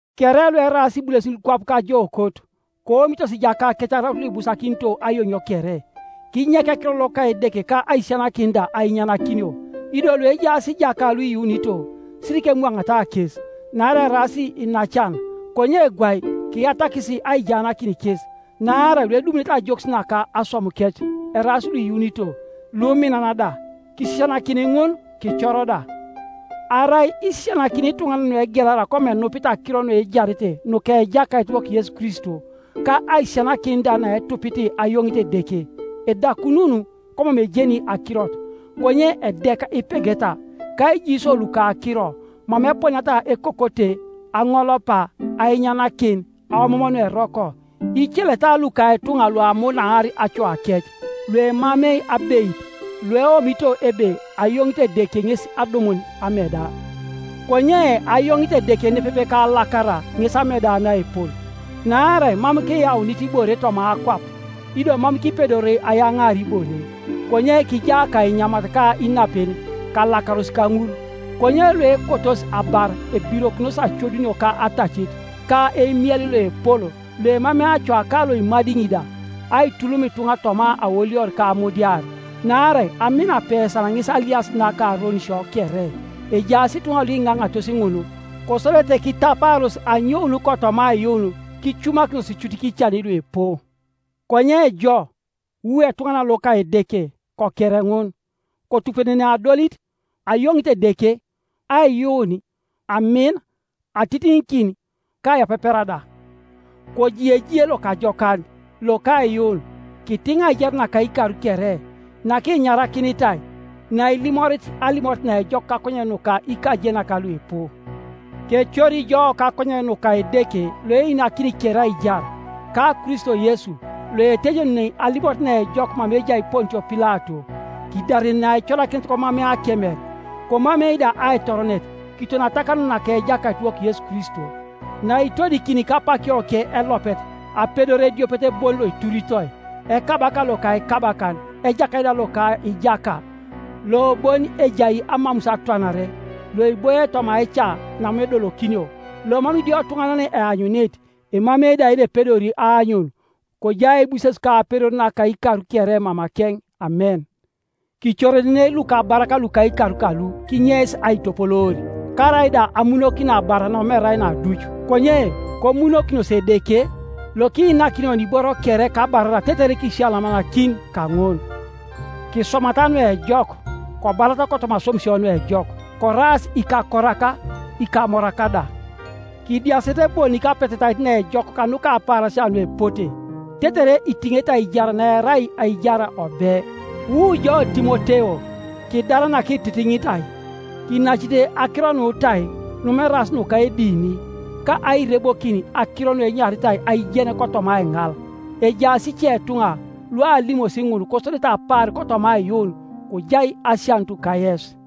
Kere lueraas ibulesin kwap kajookot, koomitos ijakakec araut luibusakinito ayoŋio kere, kinyek ekiror loka Edeke ka aisisianakin da ainyanakinio. Ido luejaas ijaka luiyuunito, sirikemwaŋata kes, naarai eraas iinacan, konye gwai kiyatakis aijaanakin kes, naarai luedumunete ajokis naka aswamukec eraas luiyuunito, luminan da. Kisisianakin ŋun, kicor da. Arai isisianakini ituŋanan nuegelara komam enupit akiro nuejarete nuka Ejakaitiwok Yesu Kristo, ka aisisianakin da naetupit ayoŋit Edeke, edakunun, komam ejeni akirot, konye edek ipegeta, ka ijiisio luka akiro, mama eponiata ekokote, aŋolopa, ainyanakin, aomoom nueroko, iceleta luka ituŋa luamunaar acoakec, lualemar abeit, lueomito ebe ayoŋit Edeke ŋes adumun ameda. Konye ayoŋit Edeke nepepe kalakara ŋes ameda naepol. Naarai mam kiyaunit ibore toma akwap, ido mam kipedori ayaŋaar ibore; konye kijaa ka inyamat ka inapen, kalakaros kaŋul. Konye luekotos abar ebirokinos acodunio ka atacit, ka eimiel loepol loemamei acoa ka loimadiŋi da, aitulum ituŋa toma aolior ka amudiar. Naarai amin apesan ŋes aliasit naka aronisio kere; ejaas ituŋa luiŋaŋatos ŋun, kesodete kitapaaros anyoun kotoma aiyuun, kicumakinos cut kican luipu. Konye jo, wu etuŋanan loka Edeke, koker ŋun, kotupenenei adolit, ayoŋit Edeke, aiyuun, amin, atitiŋikin, ka aiyapepera da. Koji ejie lokajokan loka aiyuun; kitiŋ aijar naka ikar kere, nakinyarakinitai, nailimorit alimoret naejok kakonyen nuka ikajenak luipu. Kecori jo kakonyen nuka Edeke loeinakini kere aijar, ka Kristo Yesu loetejenuni alimoret naejok mama ejai Pontio Pilato, kidarenenei aicorakinet komamei akemer, komamei da aitoronet, kiton atakanun naka Ejakaitiwok Yesu Kristo; naitodikini kapakioke Elopet apedor ediopet bon loituritoi, Ekabaka loka ikabakan, Ejakait da loka ijaka, lobon ejai amamus atwanare, loiboie toma aica namam edolokinio, lomam idiotuŋanan eanyunit, emamei da yenepedori aanyun. Kojai aibuses ka apedor naka ikar kere mamakeŋ, Amen. Kicorenenei lukabarak luka ikar kalu kinyeis aitopoloor, karaida amunokin abar namam erai naduc, konye komunokinos Edeke, lokiinakini oni iboro kere kabarara tetere kisiyalamanakin kaŋun, Kiswamata nuejok, kobarata kotoma aswamisio nuejok, koraas ikakorak, ikamorak da, kidiasete bonik apetetait naejok kanuka apaarasia nuepote, tetere itiŋete aijar naerai aijar obe. Wu jo Timoteo, kidar nakititinitai. Kinacite akiro nutai numam eraas nuka edini, ka airebokin akiro nuenyaritai aijen kotoma aiŋal, ejaas icetuŋa lualimosi ŋun, kosodete apaar kotoma aiyuun. Kojai asianut kayes.